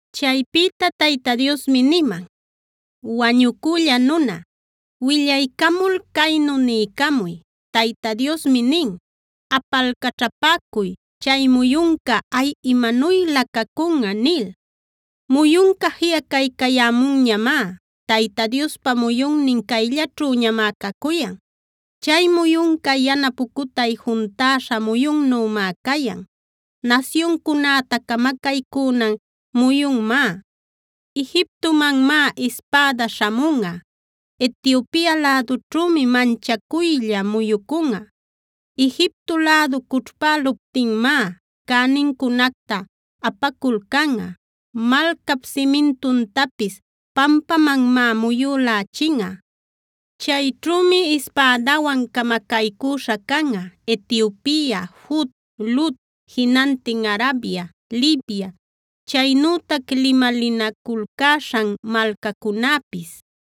Chaypïta Tayta Diosmi niman: “Wañucülla nuna, willaycamul caynu niycamuy: Tayta Diosmi nin: “Apalcaćhapäcuy: ‘Chay muyunca, ¡ay, imanuylä cacunꞌa!’ nil. Muyunca jiꞌacaycayämunñamá. Tayta Diospa muyunnin cayllaćhüñamá cacuyan. Chay muyunca yana pucutay juntäśha muyunnümá cayan; nasyuncunäta camacaycünan muyunmá. Egiptomanmá ispäda śhamunꞌa; Etiopia lädućhümi manchacuylla muyucunꞌa. Egipto lädu cućhpäluptinmá cänincunacta apaculcanꞌa. Malcap simintuntapis pampamanmá muyülächinꞌa. Chayćhümi ispädawan camacaycüśha canꞌa: Etiopia, Fut, Lud, jinantin Arabia, Libia, chaynütac limalinaculcäśhan malcacunäpis.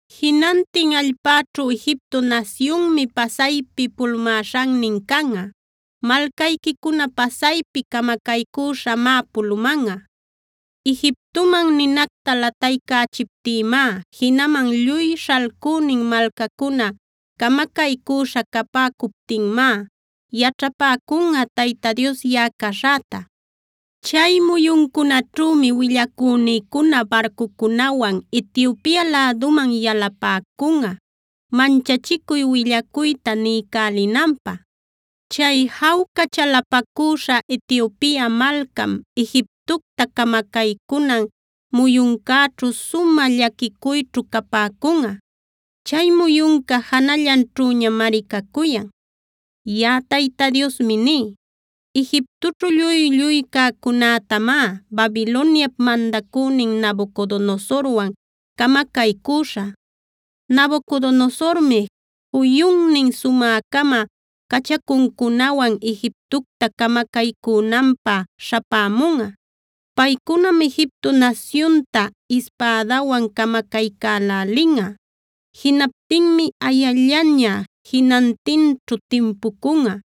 “Jinantin allpäćhu Egipto nasyunmi pasaypi pulumäśhannin canꞌa. Malcayquicuna pasaypi camacaycüśhamá pulumanꞌa. Egiptoman ninacta lataycächiptïmá, jinaman lluy śhalcünin malcacuna camacaycüśha capäcuptinmá yaćhapäcunꞌa Tayta Dios yaꞌa caśhäta. “Chay muyuncunaćhümi willacünïcuna barcucunawan Etiopia läduman yalapäcunꞌa manchachicuy willacuyta niycälinanpä. Chay jawca chalapacüśha Etiopia malcam Egiptocta camacaycunan muyuncäćhu sumä llaquicuyćhu capäcunꞌa. Chay muyunca janallanćhüñamari cacuyan. “Yaꞌa Tayta Diosmi ní: Egiptoćhu lluy-lluy cäcunätamá Babiloniap mandacünin Nabucodonosorwan camacaycüśhä. Nabucodonosormi juyunnin sumä-cama cachacuncunawan Egiptocta camacaycünanpä śhapämunꞌa. Paycunam Egipto nasyunta ispädawan camacaycälälinꞌa. Jinaptinmi ayallaña jinantinćhu timpucunꞌa.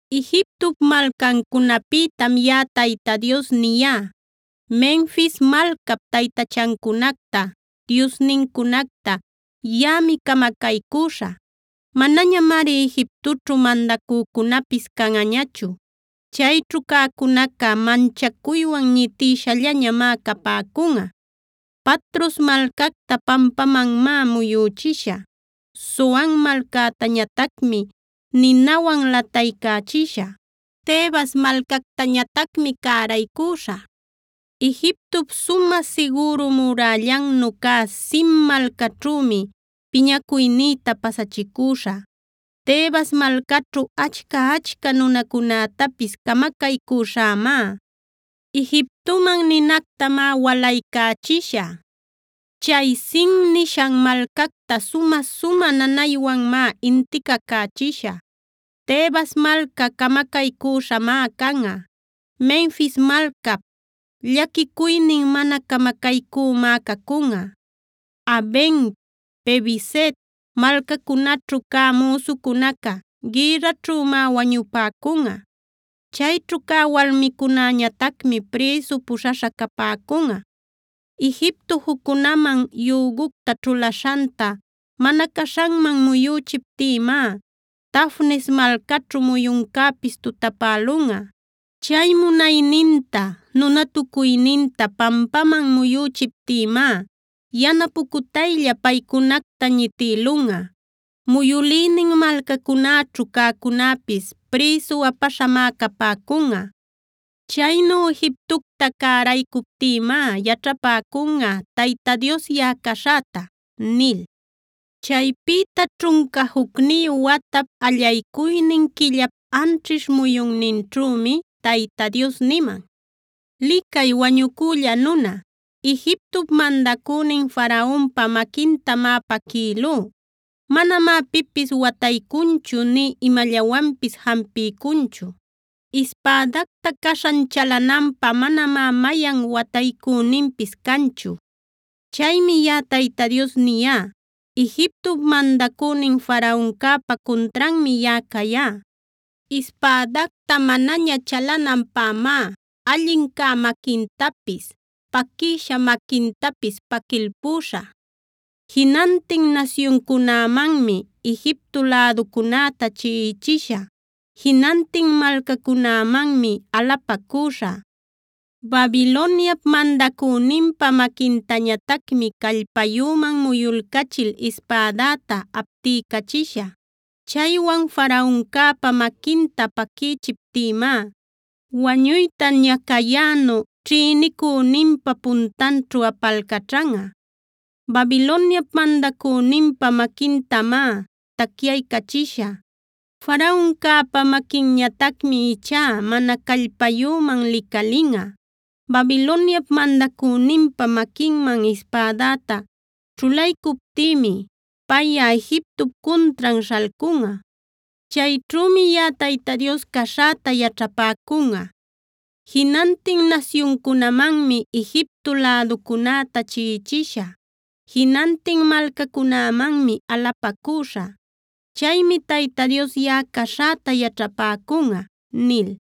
“Egiptop malcancunapïtam yaꞌa Tayta Dios niyá: “Menfis malcap taytachancunacta, diosnincunacta yaꞌami camacaycüśhä. Manañamari Egiptoćhu mandacücunapis canꞌañachu. Chayćhu cäcunaca manchacuywan ñitïshallañamá capäcunꞌa. Patros malcacta pampamanmá muyüchishä. Zoan malcactañatacmi ninawan lataycächishä. Tebas malcactañatacmi cäraycüśhä. “Egiptop sumä sigüru murällannu cä Sin malcaćhümi piñacuynïta pasachicüśhä. Tebas malcaćhu achca-achca nunacunätapis camacaycüśhämá. Egiptoman ninactamá walaycächishä. Chay Sin nishan malcacta sumä-sumä nanaywanmá inticacächishä. Tebas malca camacaycüśhamá canꞌa. Menfis malcap llaquicuynin mana camacaycümá cacunꞌa. Aven, Pibeset malcacunaćhu cä müsucunaca gïrraćhümá wañupäcunꞌa. Chayćhu cä walmicunäñatacmi prïsu puśhaśha capäcunꞌa. Egipto juccunaman yügucta ćhulaśhanta mana caśhanman muyüchiptïmá Tafnes malcaćhu muyuncäpis tutapälunꞌa. Chay munayninta, nunatucuyninta pampaman muyüchiptïmá yana pucutaylla paycunacta ñitïlunꞌa. Muyülïnin malcachacunäćhu cäcunäpis prïsu apaśhamá capäcunꞌa. Chaynu Egiptocta cäraycuptïmá yaćhapäcunꞌa Tayta Dios yaꞌa caśhäta” nil. Chaypïta ćhunca jucniyu watap, allaycuynin quillap, anćhish muyunninćhümi Tayta Dios niman: “Licay wañucülla nuna, Egiptop mandacünin Faraonpa maquintamá paquïlú. Manamá pipis wataycunchu nï imallawanpis jampiycunchu. Ispädacta caśhan chalananpä manamá mayan wataycüninpis canchu. Chaymi yaꞌa Tayta Dios niyá: Egiptop mandacünin Faraoncäpa cuntranmi yaꞌa cayá. Ispädacta manaña chalananpämá allin cä maquintapis, paquïsha maquintapis paquilpüśhä. Jinantin nasyuncunämanmi Egipto läducunäta chiꞌichishä. Jinantin malcacunämanmi alapacüśhä. Babiloniap mandacüninpa maquintañatacmi callpayüman muyuycachil ispädäta aptiycachishä. Chaywan Faraoncäpa maquinta paquïchiptïmá wañuyta ñacayänu ćhïnicüninpa puntanćhu apalcaćhanꞌa. Babiloniap mandacüninpa maquintamá tacyaycachishä. Faraoncäpa maquinñatacmi ichá mana callpayüman licalinꞌa. Babiloniap mandacüninpa maquinman ispädäta ćhulaycuptïmi payꞌa Egiptop cuntran śhalcunꞌa. Chayćhümi yaꞌa Tayta Dios caśhäta yaćhapäcunꞌa. Jinantin nasyuncunamanmi Egipto läducunäta chiꞌichishä. Jinantin malcacunämanmi alapacüśhä. Chaymi Tayta Dios yaꞌa caśhäta yaćhapäcunꞌa” nil.